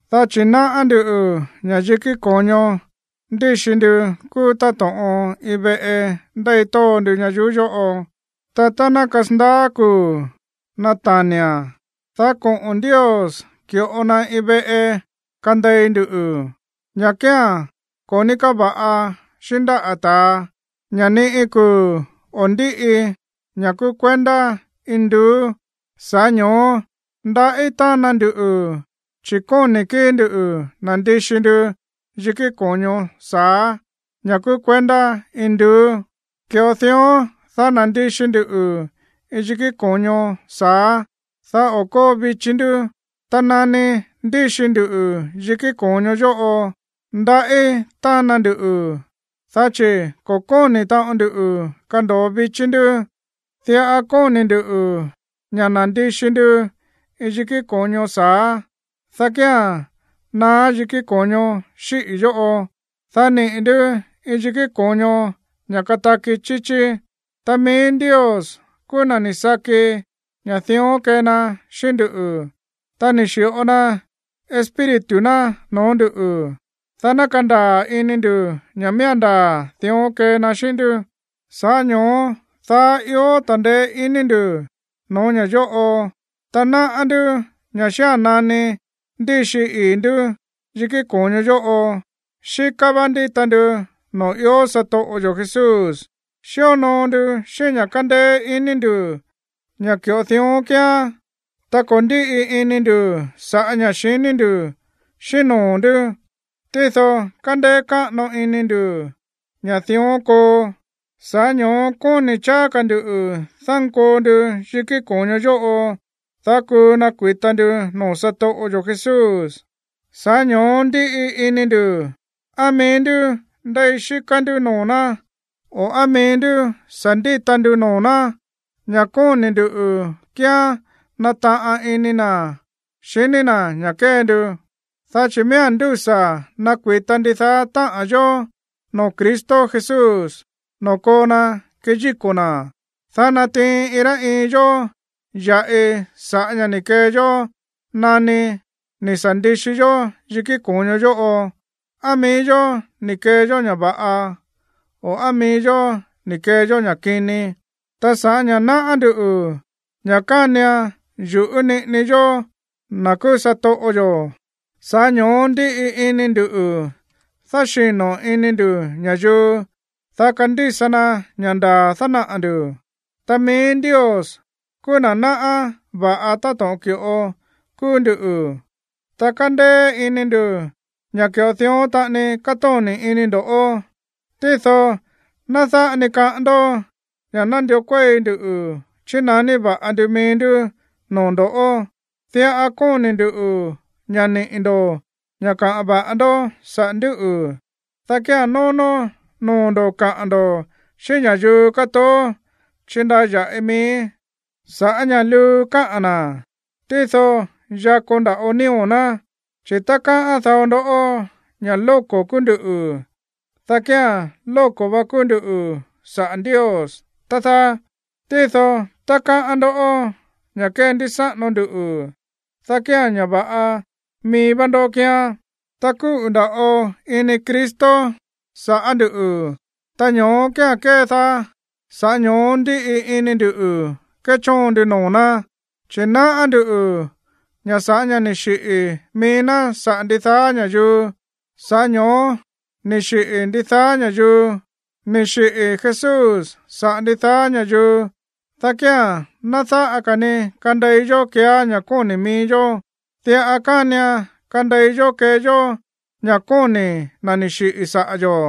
Dá chi̱ náꞌá nduꞌu̱ ña̱ yikí ko̱ño ndíxi ndu kúú táto̱ꞌon iin veꞌe ndéi tóo ndu ñayuú yóꞌo. Ta tá ná kasandaá kuu̱ nata̱ni̱a̱n, dá koꞌo̱n Ndios ki̱ꞌo na iin veꞌe kandei ndu, ña̱ kía̱n ko̱ ní káva̱ꞌa xíꞌín ndáꞌa̱ ta̱a, ña̱ ni iin kuu̱ o̱ ndíꞌi, ña̱ kúú kuendá induú. Sa̱ꞌá ño̱ó ndaꞌí tána ndu, chi̱ kóni̱ kíi̱ ndu̱ nandixi ndu yikí ko̱ño sa̱á, ña̱ kúú kuendá induú. Ki̱ꞌo dión, dá nandixi ndu iin yikí ko̱ño sa̱á, dá o̱ kóo vichí ndú. Ta nani ndíxi ndu yikí ko̱ño yóꞌo, ndaꞌí tána ndu, dá chi̱ ko̱ kóni̱ taꞌon ndu kando̱o vichí ndú. Diꞌa kóni̱ ndu̱ ña̱ nandixi ndu iin yikí ko̱ño sa̱á, dá kía̱n naá yikí ko̱ño xíꞌi̱ yóꞌo, dá niꞌi̱ ndú iin yikí ko̱ño ña̱ kataki chíchí. Ta mií Ndios kúú na̱ ni̱ saki ña̱ dión kee na xíꞌín ndú, ta ni̱ xi̱ꞌo na Espíritu ná noo̱ ndú, dá ná kandaa̱ ini ndu̱ ña̱ miía̱n ndaa̱ dión kee na xíꞌín ndú. Sa̱ꞌá ño̱ó daá ió ta̱ndeé iní ndu̱ no̱ó ña̱ yóꞌo, ta náꞌá ndú ña̱ xía̱n nani ndíxi ii̱ ndú yikí ko̱ño yóꞌo, xíká vá ndíta ndu noo̱ ió satoꞌo yo̱ Jesús. Xíonoo ndu xíꞌín ña̱ kándéé iní ndu̱ ña̱ ki̱ꞌo dión kíán, ta ko̱ ndíꞌi ini ndu̱ sa̱ꞌá ña̱ xiní ndu̱ xíꞌín noo̱ ndú. Tído kándéé káꞌano ini ndu̱ ña̱ dión koo, sa̱ꞌá ño̱ó kóni̱ cháá ka̱ ndu̱ dánkoo ndu yikí ko̱ño yóꞌo, dá kuu nakui̱ta ndu noo̱ satoꞌo yo̱ Jesús. Sa̱ꞌá ño̱ó ndíꞌi ini ndu̱, á mií ndú ndéi xíká ndú noo̱ ná o á mií ndú sa̱ ndíta ndu noo̱ ná, ña̱ kóni̱ ndu̱ kíán nataꞌan ini na̱ xiní na̱ ña̱ kée ndu. Dá chi̱ miía̱n ndúsa̱ nakui̱ta ndidaá táꞌa̱n yó noo̱ Cristo Jesús, noo̱ koo na keyíko̱ na̱, dá natiin iin rá iin yó ya̱ꞌi sa̱ꞌá ña̱ ni̱ kee yó nani ni̱ sa̱ ndixi yó yikí ko̱ño yóꞌo, á mií yó ni̱ kee yó ña̱ va̱ꞌa, o á mií yó ni̱ kee yó ña̱ kini. Ta sa̱ꞌá ña̱ náꞌá ndú ña̱ kánian yu̱ꞌú niꞌini yó na̱ kúú satoꞌo yo̱, sa̱ꞌá ño̱ó ndíꞌi ini ndu̱ dáxino̱ ini ndu̱ ña̱yuu, dá kandísa na ña̱ ndaa̱ dánaꞌa̱ ndu̱. Ta mií Ndios kúú na̱ náꞌá va̱ꞌa táto̱ꞌon ki̱ꞌo kúú ndú, ta kándéé iní ndu̱ ña̱ ki̱ꞌo dión taꞌani kátóni̱ ini ndo̱. Tído ná dáꞌa ni kaꞌán ndó ña̱ nandió kuéi ndu chinaní va̱ꞌa ndu mií ndú noo̱ ndo̱, diꞌa kóni̱ ndu̱ ña̱ niꞌi̱ ndo̱ ña̱ kaꞌa̱n va̱ꞌa ndó saꞌa̱ ndúꞌu̱, dá kía̱n nónó noo̱ ndo̱ kaꞌa̱n ndo̱ xíꞌín ña̱yuu kátoó chíndaya̱ꞌii mií sa̱ꞌá ña̱ luu káꞌa̱n na̱, tído yakó nda̱ꞌo nío̱ ná. Chi̱ tá káꞌán dao ndó ña̱ lóko̱ kúú ndú, dá kía̱n lóko̱ va kúú ndú sa̱ꞌá Ndios, tá dáá. Tído tá káꞌán ndó ña̱ kéndísáꞌano ndu, dá kía̱n ña̱ va̱ꞌa mií vá ndó kíán. Ta kúꞌu̱ nda̱ꞌo ini Cristo saꞌa̱ ndú, ta ño̱ó kía̱n kédaá, sa̱ꞌá ño̱ó ndíꞌi ini ndu̱ kéchóon ndu noo̱ ná, chi̱ náꞌá ndú ña̱ sa̱ꞌá ña̱ ni̱ xiꞌi̱ mií ná saꞌa̱ ndidaá ña̱yuu, sa̱ꞌá ño̱ó ni̱ xiꞌi̱ ndidaá ña̱yuu. Ni̱ xiꞌi̱ Jesús saꞌa̱ ndidaá ña̱yuu, dá kía̱n ná dáꞌa ka̱ ni kandei yó keeá ña̱ kóni̱ mií yó. Diꞌa kánian kandei yó kee yó ña̱ kóni̱ na̱ ni̱ xiꞌi̱ saꞌa̱ yo̱,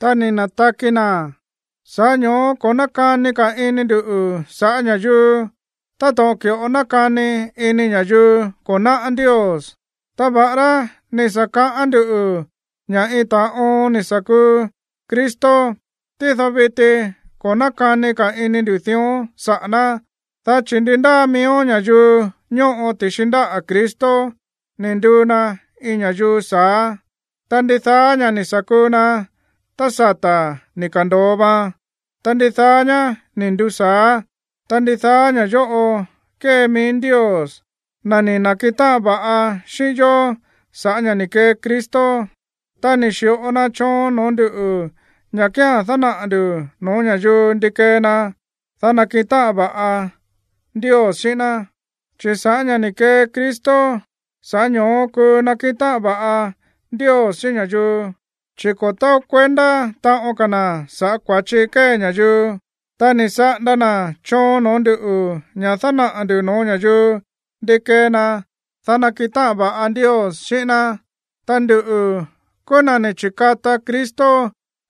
ta ni̱ na̱taki na̱. Sa̱ꞌá ño̱ó ko̱ nákani ka̱ ini ndu̱ sa̱ꞌá ña̱yuu táto̱ꞌon ki̱ꞌo nákani ini ña̱yuu ko̱ náꞌá Ndios. Ta va̱ꞌará ni̱ sa̱ kaꞌán ndú ña̱ iin ta̱a oon ni̱ sa̱ kuu Cristo, tído viti ko̱ nákani ka̱ ini ndu̱ dión saꞌa̱ ná. Dá chi̱ ndi ndáa miíó ña̱yuu ñóꞌo ti̱xi ndáꞌa̱ Cristo, ni̱ nduu na iin ña̱yuu sa̱á. Ta ndidaá ña̱ ni̱ sa̱ kuu na tá sata̱ ni̱ ka̱ndo̱o vaan, ta ndidaá ñá ni̱ nduu sa̱á. Ta ndidaá ña̱ yóꞌo kée mií Ndios, na̱ ni̱ na̱kiꞌin táꞌan va̱ꞌa xíꞌín yó sa̱ꞌá ña̱ ni̱ kee Cristo. Ta ni̱ xi̱ꞌo na choon no̱ó nduꞌu̱ ña̱ kía̱n dánaꞌa̱ ndu̱ no̱ó ña̱yuu ndi kee na, dá nakiꞌin táꞌan va̱ꞌa Ndios xíꞌín ná. Chi̱ sa̱ꞌá ña̱ ni̱ kee Cristo, sa̱ꞌá ño̱ó kuu nakiꞌin táꞌan va̱ꞌa Ndios xíꞌín ña̱yuu, chi̱ ko̱ taó kuendá taꞌon ka̱ na̱ sa̱ꞌá kua̱chi kée ña̱yuu. Ta ni̱ saꞌanda na̱ choon no̱ó ndu̱ ña̱ dánaꞌa̱ ndu̱ no̱ó ña̱yuu ndi kee na, dá nakiꞌin táꞌan va̱ꞌa Ndios xíꞌín ná. Ta nduꞌu̱ kúú na̱ ni̱ chi̱kata Cristo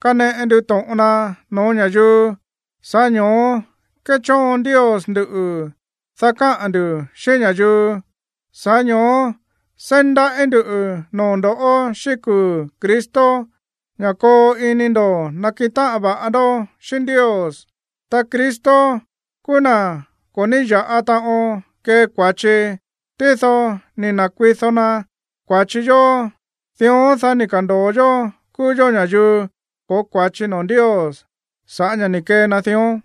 kaneꞌe ndu to̱ꞌon na no̱ó ña̱yuu, sa̱ꞌá ño̱ó kéchóon Ndios nduꞌu̱, dá káꞌa̱n ndu̱ xíꞌín ña̱yuu. Sa̱ꞌá ño̱ó seí ndaꞌí ndu̱ noo̱ ndo̱ꞌó xíꞌín kuu̱ Cristo ña̱ koo ini ndo̱ nakiꞌin táꞌan va̱ꞌa ndó xíꞌín Ndios. Ta Cristo kúú na̱ ko̱ ní ya̱ꞌa taꞌon kee kua̱chi, tído ni̱ na̱kuido na kua̱chi yó, dión, dá ni̱ ka̱ndo̱o yó kúú yó ña̱yuu ko̱ó kua̱chi noo̱ Ndios sa̱ꞌá ña̱ ni̱ kee na dión.